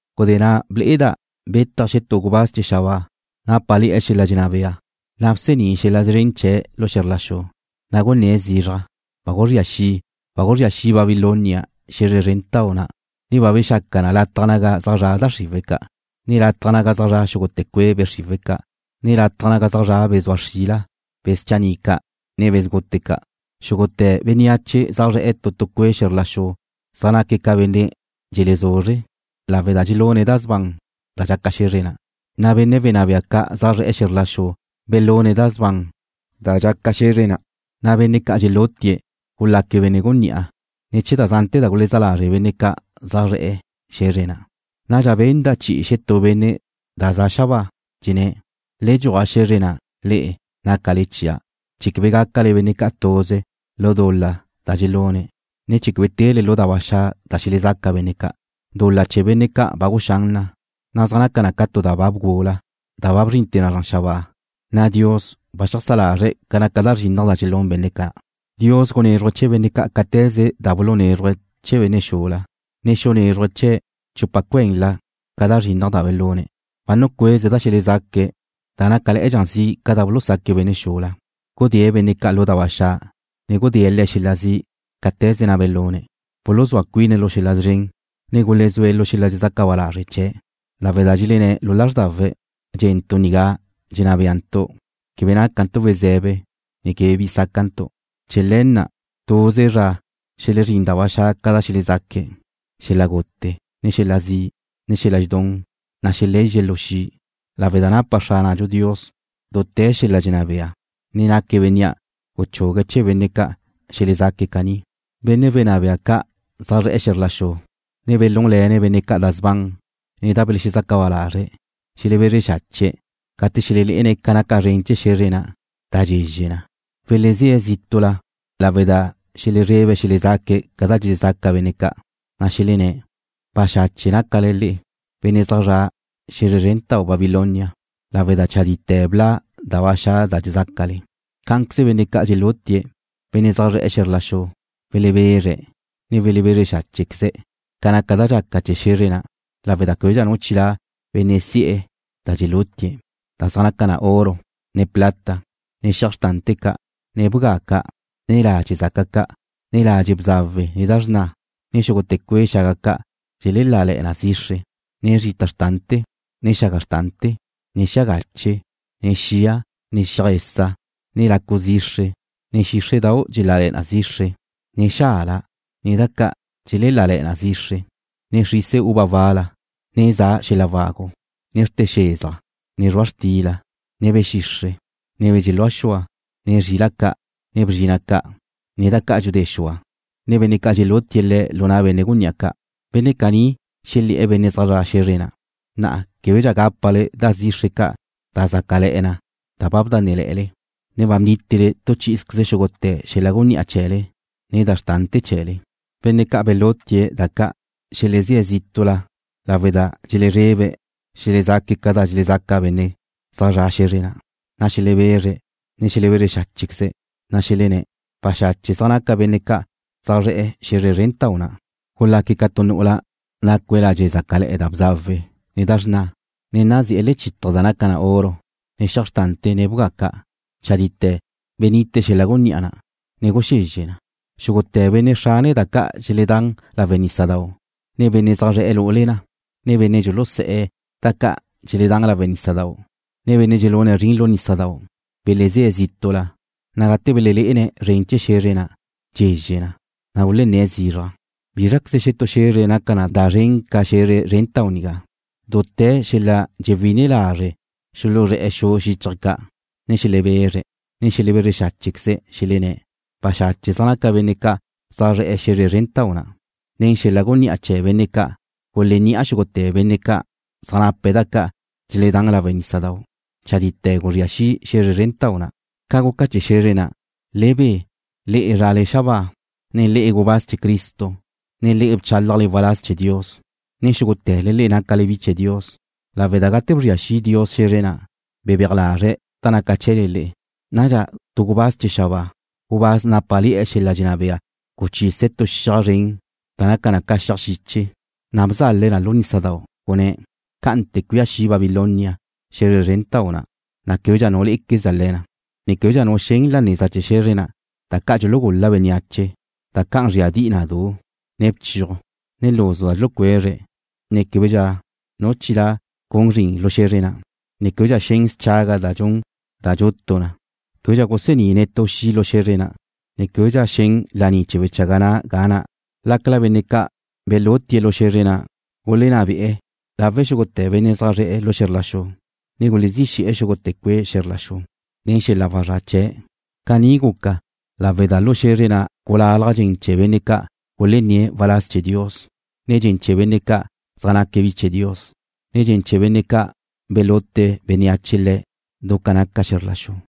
Gudé na' ble'eda' betaj xetú gubáz chee̱ xabáa, nápale̱'e̱ xel-la' dxenná bea, na' bsení' xel-la' szren chee̱' lu xe̱zr la xu. Na' gunné̱' zizraj: ―Ba guzría xi'. Ba guzría xi' Babilonia, xe̱zre zrentau' na', ne ba bexaca na lataj naga zaj zra' da xriwe̱' ca', ne lataj naga zaj zra' xúgute̱ cue' be' xriwe̱' ca', ne lataj naga zaj zra' be̱ zua xrila, be̱ schanni' ca', ne be̱ sgute ca'. Xúgute̱ bénneache zaj zre̱'e̱ tu tu cue' xe̱zr la xu zaj naque̱' ca benne' dxelezuzre', lawe' da dxelune̱' da sban da dxaca xe̱zre na', na' benne' wenná bea ca' zaj zre̱'e̱ xe̱zr la xu belune̱' da sban da dxaca xe̱zre na', na' benne' ca' dxelúti'e gulaque̱' benne' gunní'a ne̱ chee̱ da zante̱ da gulezá lazre' benne' ca' zaj zre̱'e̱ xe̱zre na'. Nadxa benda' chi'i xetú benne' da za xabáa, dxenné̱': ―Le dxuaj xe̱zre na', le'e, nácale chia', chee̱ quebe gácale benne' ca' tuze lu dul-la da dxelune̱', ne chee̱ quebe tele lu da ba xa' da xelezaca benne' ca'. Dul-la chee̱ benne' ca' ba guxán na, na' zaj naca na ca tu da ba bgula, da ba bzrinte̱ na zran xabáa, na' Dios ba xeajsá lazre̱' ca naca da zrinnaj da dxelún benne' ca'. Dios gunézruje̱' chee̱ benne' ca' cáte̱ze da bulunézruje̱' chee̱ benne' xula, ne xunézruje̱' le̱' chupa cuenla ca da zrinnaj da belune̱'. Ba nucueze̱' da xelezaque̱' da nácale̱'e̱dxa zi' ca da bulusaque̱' benne' xula. Gudée̱' benne' ca' lu da ba xa', ne gudée̱' le̱' xel-la' zi' cáte̱ze na' belune̱'. Buluzúa cuine̱' lu xel-la' szren, ne gulezúe̱' lu xel-la' dxelexezaca ba lazre' chee̱', lawe' da dxelenné̱' lu lázrdawe̱': Dxé'entu' nigá dxenná béantu'. Quebe nácantu' we̱ze̱be, ne quebe bi sácantu'. Chee̱ le̱ na', tuze zra xelezrín da ba xa' ca' da xelezaque̱', xel-la' gute, ne xel-la' zi', ne xel-la' dxedún, na' xelezxe̱' lu xi', lawe' da napa Xránadxu Dios dute̱ xel-la' dxenná bea, na' naque̱' Bénnea' guchugue̱' chee̱ benne' ca' xelezaque̱' caní. Benne' wenná bea ca' zaj zre̱'e̱ xe̱zr la xu, ne belúnle̱ne̱' benne' ca' da sban ne da belexezaca ba lazre̱', xelebezre xache̱' gate xelelé'ene̱' ca naca zren chee̱ xe̱zre na', da dxezxe na. Welezé̱' zítu'la lawe' da xelezrebe̱' xelezaque̱' ca da dxelezaca benne' ca', na' xelenné̱': ―Baxache' nácale le'e, benne' zaj zre̱'e̱ xe̱zre zrentau', Babilonia, lawe' da chadite̱ bla' da ba xa' da dxezácale. Cá'anqueze benne' ca' dxelúti'e, benne' zaj zre̱'e̱ xe̱zr la xu, welebezre̱', ne welebezre xáchequeze̱' ca naca da dxaca chee̱ xe̱zre na', lawe' da québedxa nu chilá' benne' si'e̱ da dxeluti'e̱, da zaj naca oro, ne plata, ne xiaj xrtante̱ ca', ne bga ca', ne ladxe' zaca ca', ne ladxe' bzawe ne da xrna, ne xúgute̱ cue' xaga ca' dxelelále̱'e̱ na zixre, ne zrita xrtante̱, ne xaga xrtante̱, ne xia gache, ne xia, ne xiaj esa', ne lacu zixre, ne xíxre'dau' dxelále̱'e̱ na zixre, ne xala, ne da ca' dxelelále̱'e̱ na zixre, ne xrise uva wala, ne za xel-la' wagu, ne xrte xezaj, ne zrua' xtila, ne be̱ xixre', be̱ dxelúa xua', ne zrila' ca', ne bzrina' ca', ne da ca' dxudé xua, ne benne' ca' dxelúti'e̱ le̱' lu na' benne' gunní'a ca'. Benne' caní xelé̱'e̱ benne' zaj zre̱'e̱ xe̱zre na': ―Na'a québedxa gápale da zixre ca' da zácale̱'e̱ na da bdánnele̱'e̱le, ne ba bnítele tu chí'izqueze xúgute̱ xel-la' gunní'a chee̱le, ne da xrtante̱ chee̱le. Benne' ca' belúti'e̱ da ca' xelezé̱' zítu'la lawe' da dxelezrebe̱' xelezaque̱' ca da dxelezaca benne' zaj zre̱'e̱ xe̱zre na', na' xelebezre̱', ne xelebezre xáchequeze̱', na' xelenné̱': ―Baxache' zaj naca benne' ca' zaj zre̱'e̱ xe̱zre zrentau' na'. Gulaque̱' ca tu nu'ula nacue̱' ladxe' zácale̱'e̱ da bzawe, ne da xrna, ne nazí'e̱ lechítaje̱ da naca na oro, ne xiaj xrtante̱, ne bga ca'. Chadite̱ benite xel-la' gunní'a na', ne guxezxe na. Xúgute̱ benne' xrane da ca' dxeledán lawe' nísadau', ne benne' zaj zre̱'e̱ lu'ule na, ne benne' dxulusé̱'e̱ da ca' dxeledán lawe' nísadau', ne benne' dxelune̱' zrin lu nísadau' belezé̱' zítu'la, na' gate belelé'ene̱' zren chee̱ xe̱zre na' dxezxe na, na' gulenné̱' zizraj: ―¿Bízraqueze xetú xe̱zre naca na da zren ca xe̱zre zrentau' nigá? Dute̱ xel-la' dxelexewí'ine lazre' xuluzré̱'e̱ xu xíchaje̱' ca', ne xelebezre̱', ne xelebezre xáchequeze̱', xelenné̱': ―Baxache' zaj naca benne' ca' zaj zre̱'e̱ xe̱zre zrentau' na'. Nen xel-la' gunní'a chee̱ benne' ca' gulenni'a xúgute̱ benne' ca' zaj nape̱' da ca' dxeledán lawe' nísadau'. Chadite̱ guzría xi' xe̱zre zrentau' na'. Ca guca chee̱ xe̱zre na', le be, le'e zrale xabáa, ne le'e, gubáz chee̱ Cristo, ne le'e bchálajle waláz chee̱ Dios, ne xúgute̱le le'e nácale bi chee̱ Dios, lawe' da gate bzria xi' Dios xe̱zre na', bebéaj lazre̱' da naca chee̱le le'e. Nadxa tu gubáz chee̱ xabáa, gubáz nápale̱'e̱ xel-la' dxenná bea guchise̱' tu xiaj zren da naca na ca xiaj xiche, na' bzale̱' na lu nísadau', gunné̱': ―Cá'ante cuía xi' Babilonia, xe̱zre zrentau' na', na' québedxa nu lé'equezdxa le̱ na, ne québedxa nu xen la neza chee̱ xe̱zre na' da ca' dxulugul-la bénneache, da can zríadi'i na du, ne bchiuj, ne luzu da dxulucuezre̱', ne québedxa nu chilá' gun zrin lu xe̱zre na', ne québedxa xen schaga da dxun da dxutu na. Québedxa gusení' netú xi' lu xe̱zre na', ne québedxa xen laní chee̱ wechaga na' ga na', lácala benne' ca' belúti'e̱ lu xe̱zre na' gulenná be'e̱ lawe' xúgute̱ benne' zaj zre̱'e̱ xe̱zr la xu, ne gulezí xe̱'e̱ xúgute̱ cue' xe̱zr la xu nen xel-la' wazrá' chee̱'. Caní guca lawe' da lu xe̱zre na' gulalaj dxen chee̱ benne' ca' gulenné̱' waláz chee̱ Dios, ne dxen chee̱ benne' ca' zaj naque̱' bi chee̱ Dios, ne dxen chee̱ benne' ca' belute bénneache le̱' du ca naca xe̱zr la xu.